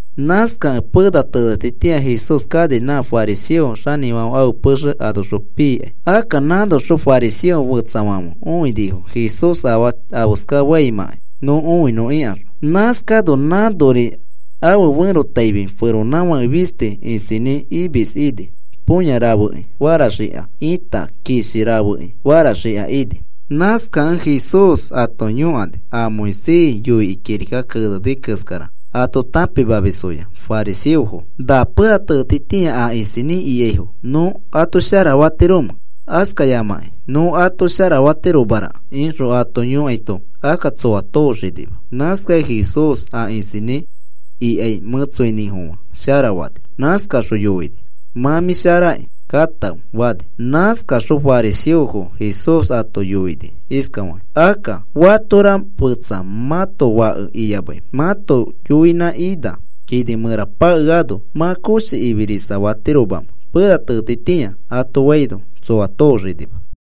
Nãskakẽ pena tenetitĩa Jesús kani nã fariseo xanĩfãfe ãfe pexe anoxõ pikai. Akka nãnoxõ fariseo fetsafãfe õinifo Jesús afaa afeska faimãkai nõ õinõ ikaxõ. Nãskano nãnori ãfe ferotaifi feronãfake fisti isinĩ imis ini põya rafeki faraxika ita kishi rafeki faraxika ini. Nãskakẽ Jesús ato yõkani, a Moisés yoikĩ kirika keneni keskara ato tãpimamisfoya fariseofo: “¿Na pena tenetitĩa a isinĩ ikaifo nõ ato sharafatiromẽ, askayamakĩ nõ ato sharafatiromaraka?” ixõ ato yõkaito, akka tsõa tooxanima. Nãskakẽ Jesús a isinĩ ikai mẽtsoinĩfofã sharafani. Nãskaxõ yoini: “Mã mĩ sharaki, katãfe,” fani. Nãskaxõ fariseofo Jesús ato yoini iskafaki: “Akka, ¿fatora mã fẽtsa, mãto fake iyamãi mãto yoinã ina kini mẽra pakeano mã koshi ifirisa fatiromamẽ pena tenetitĩa?” ato faino, tsõa kemanima.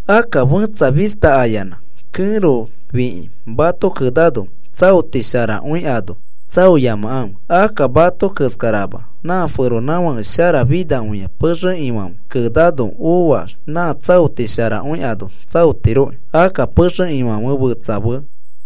“Akka fẽtsa fista ayanã kẽro fĩkĩ mato kenano, tsaoti sharakõi ano tsaoyamakãfe. Akka mato keskarama nã feronãfake sharafinakõia pexe ifãfe kenano oax nã tsaoti sharakõi ano tsaotiroki. Akka pexe ifãfe fetsa fe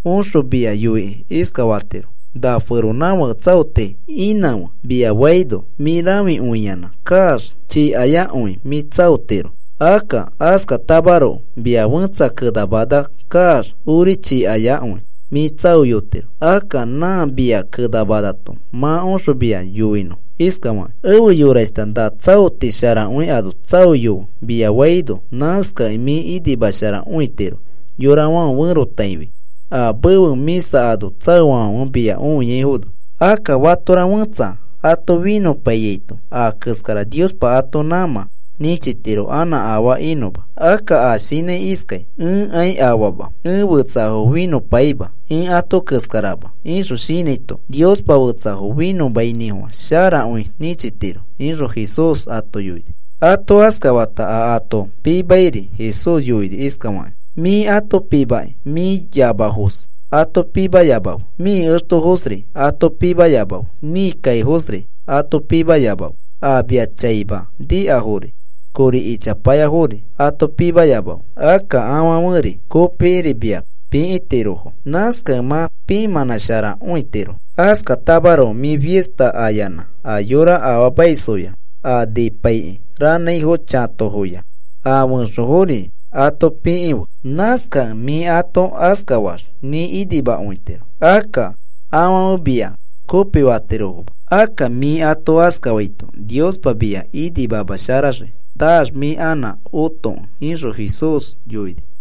oxõ mia yoikĩ iskafatiro: ‘Na feronãfake tsaoti inãfe,’ mia faino mĩ rãfikõiyanã kaax chikayakõi mĩ tsaotiro. Akka askatamaroko mia fẽtsa kenamana kaax ori chikayakõi mĩ tsaoyotiro. Akka nã mia kenamanato mã oxõ mia yoinõ iskafakĩ: ‘Efe yorashta, na tsaoti sharakõi ano tsaoyofe,’ mia faino, nãskakẽ mĩ inimasharakõitiro yorafãfe ferotaifi a mefe mĩsa ano tsaofafãfe mia õiaifono. Akka fatora fẽtsa ato finõpaiyaito a keskara Niospa ato nãmã nĩchitiro anã afaa inõma. Akka a shinãi iskai: ‘Ẽkai afama, ẽ fetsafo finõpaima, ẽ ato keskarama,’ ixõ shinãito Niospa fetsafo finõmainĩfofã sharakõi nĩchitiro,” ixõ Jesús ato yoini. Ato askafata a ato pimairi Jesús yoini iskafakĩ: “Mĩ ato pimakĩ mĩ yamafoos ato pikĩyamafe, mĩ extofoosri ato pikĩyamafe, mĩ kaifoosri ato pikĩyamafe, a mia chaima nikafori kori ichapayafori ato pikĩyamafe. Akka afãferi kopikiri mia pikĩtirofo, nãskakẽ mã pimanãsharakõitiro. Askatamaroko mĩ fista ayanã a yora afaamaisfoya a nipaikĩ ranãifo chãtofoya a fẽxofori ato pikĩfe. Nãskakẽ mĩ ato askafaax mĩ inimakõitiro. Akka afãfe mia kopifatirofoma, akka mĩ ato askafaito Niospa mia inimamasharaxii naax mĩ anã otokẽ,” ixõ Jesús yoini.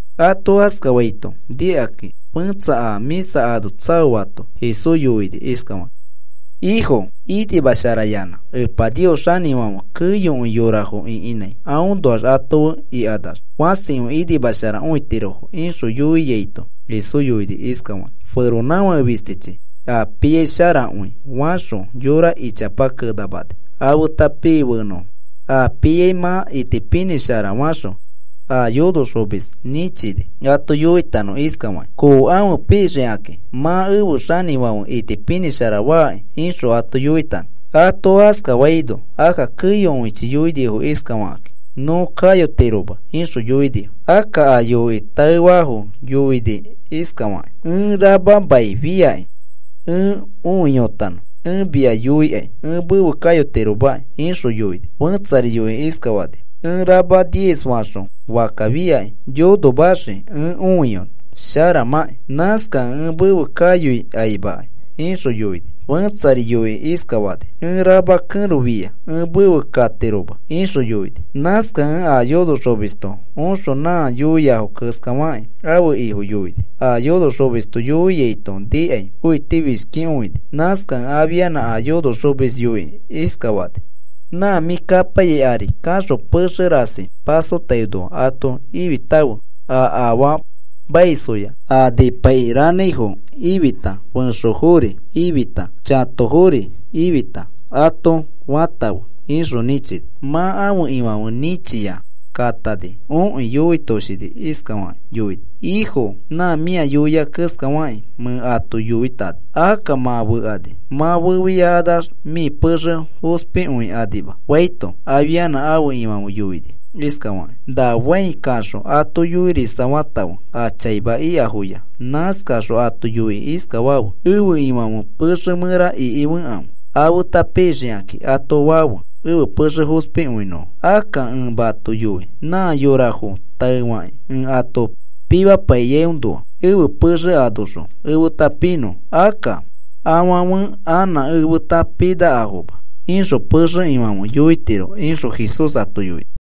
Ato askafaito nikakĩ fẽtsa a mĩsa ano tsaoato Jesús yoini iskafakĩ: “Ifo, inimasharayanã Epa Nios xanĩfãfe keyokõi yorafo ĩkinãi anoax ato fe ikanax fãsi inimasharakõitirofo,” ixõ yoiaito, Jesús yoini iskafakĩ: “Feronãfake fistichi a piai sharakõi faxõ yora ichapa kenamani afeta pii fenõfo. A piai mã itipinĩshara faxõ a yonoxomis nĩchini ato yoitanõ iskafakĩ: ‘Kookãfe pixikakĩ. Mã ẽfe xanĩfãfe itipinĩshara faki,’ ixõ ato yoitanõ. “Ato askafaino, akka keyokõichi yoinifo iskafakakĩ: ‘Nõ kayotiroma,’ ixõ yoinifo. Akka a yoikĩ taefato yoini iskafakĩ: ‘Ẽ rama mai fiaki ẽ õiyotanõ. Ẽ mia yoikai ẽ mefe kayotiromaki,’ ixõ yoini. Fẽtsari yoikĩ iskafani: ‘Ẽ rama diez faxõ fakka fiaki yonomaxii ẽ õiyonõ sharamakĩ. Nãskakẽ ẽ mefe kayoi kaimakai,’ ixõ yoini. Fẽtsari yoikĩ iskafani: ‘Ẽ rama kẽro fia. Ẽ mefe katiroma,’ ixõ yoini. “Nãskakẽ a yonoxomisto oxõ nã yoiafo keskafakĩ ãfe ifo yoini, a yonoxomisto yoiaito nikai õitifishkikõini. Nãskakẽ afianã a yonoxomis yoikĩ iskafani: ‘Nã mĩ kapaiyai ari kaxõ pexe rasi pasotainoa ato ifitãfe a afaamaisfoya, a nipaikĩ ranãifo ifita fẽxofori ifita chatofori ifita ato fatãfe,’ ixõ nĩchini. “Mã ãfe ifãfe nĩchia katani. Okĩ yoitoshini, iskafakĩ yoini: ‘Ifo, nã mĩa yoia keskafakĩ mẽ ato yoitani. Akka mã fekani, mã fefiakanax mĩ pexe fospikanima,’ faito, afianã ãfe ifãfe yoini iskafakĩ: ‘Na fãi kaxõ ato yoirisafafe a chaima ikafoya, nãskaxõ ato yoikĩ iskafafe: “Ẽfe ifãfe pexe mẽra ikikãfe afeta pixikakĩ,” ato fafe ẽfe pexe fospikõinõfo. Akka ẽ mato yoi nã yorafo taefakĩ ẽ ato pimapaiyoa ẽfe pexe anoxõ efeta pinõfo akka afãfe anã efeta pinakafoma,’ ixõ pexe ifãfe yoitiro,” ixõ Jesús ato yoini.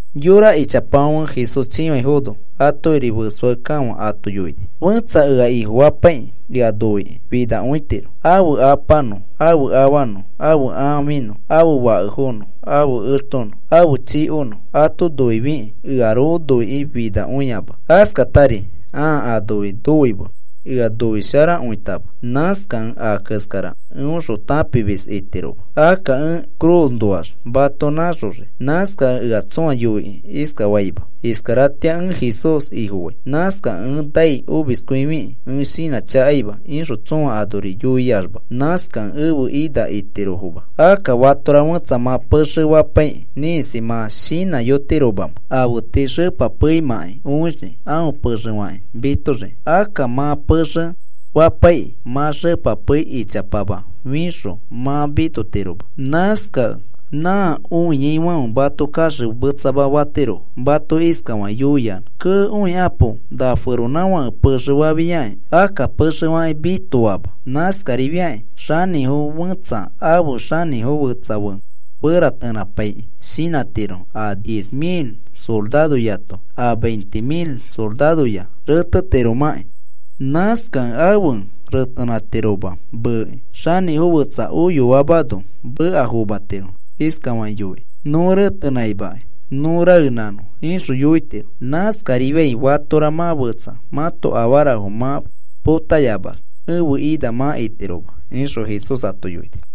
Yora ichapafãfe Jesús chĩfaifono atokiri fesoakekafã ato yoini: “Fẽtsa ea Ifofapaikĩ ea noikĩ finakõitiro. Ãfe apanõ ãfe afanõ ãfe ãfinõ ãfe fakefonõ ãfe extonõ ãfe chikonõ ato noifikĩ earoko noikĩ finakõiama, askatari ãa anoi noimei ea noisharakõitama nãskakẽ a keskara eõxõ tãpimis itiroma. Akka ẽ cruznoax mato nãxoxii. Nãskakẽ ea tsõa yoikĩ iskafaima: ‘Iskaratĩa ẽ Jesús Ifofai. Nãskakẽ ẽ nai omiskõifikĩ ẽ shinãchakaima,’ ixõ tsõa anori yoiaxma, nãskakẽ ẽfe ina itirofoma. “Akka fatora fẽtsa mã pexe fapaikĩ ĩkisi mã shinãyotiromamẽ afe tii xepa peimãki õixiki aõ pexe fakĩ mitoxiki. Akka mã pexe fapaikĩ mã xepa pei ichapama fixõ mã mitotiroma. Nãskakẽ nã õiaifãfe mato kaxemetsama fatirofo. “Mato iskafakĩ yoiyanã: ‘Kee, õikapo, na feronãfãke pexe fafiakĩ akka pexe fakĩ mitoama.’ Nãskarifiakĩ xanĩfo fẽtsa afe xanĩfo fetsa fe retenãpaikĩ shinãtiro a diez mil soraroyato a veinte mil soraroya retetiromakĩ. Nãskakẽ afe retenãtiroma meekĩ, xanĩfo fetsa oyoamano meka fomatiro iskafakĩ yoikĩ: ‘Nõ retenãimakai, nõ raenãnõ,’ ixõ yoitiro. Nãskarifiai fatora mã fetsa mãto afarafo mã potayamax ẽfe ina mã itiroma,” ixõ Jesús ato yoini.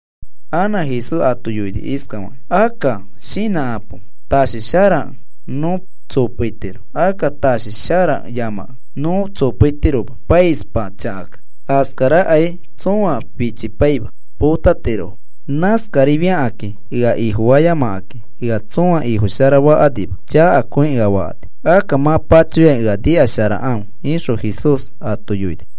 Anã Jesús ato yoini iskafakĩ: “Akka shinãkãpo. Tashi sharakẽ nõ tsopeitiro. Akka tashi sharayamakẽ nõ tsopeitiroma, paispa chakakẽ. Askarakai tsõa fichipaima. Potatirofo. Nãskariakakĩ ea Ifofayamakakĩ ea tsõa Ifofasharakanima chakakõi ea fakani. Akka mã pachoyakĩ ea nikasharakãfe,” ixõ Jesús ato yoini.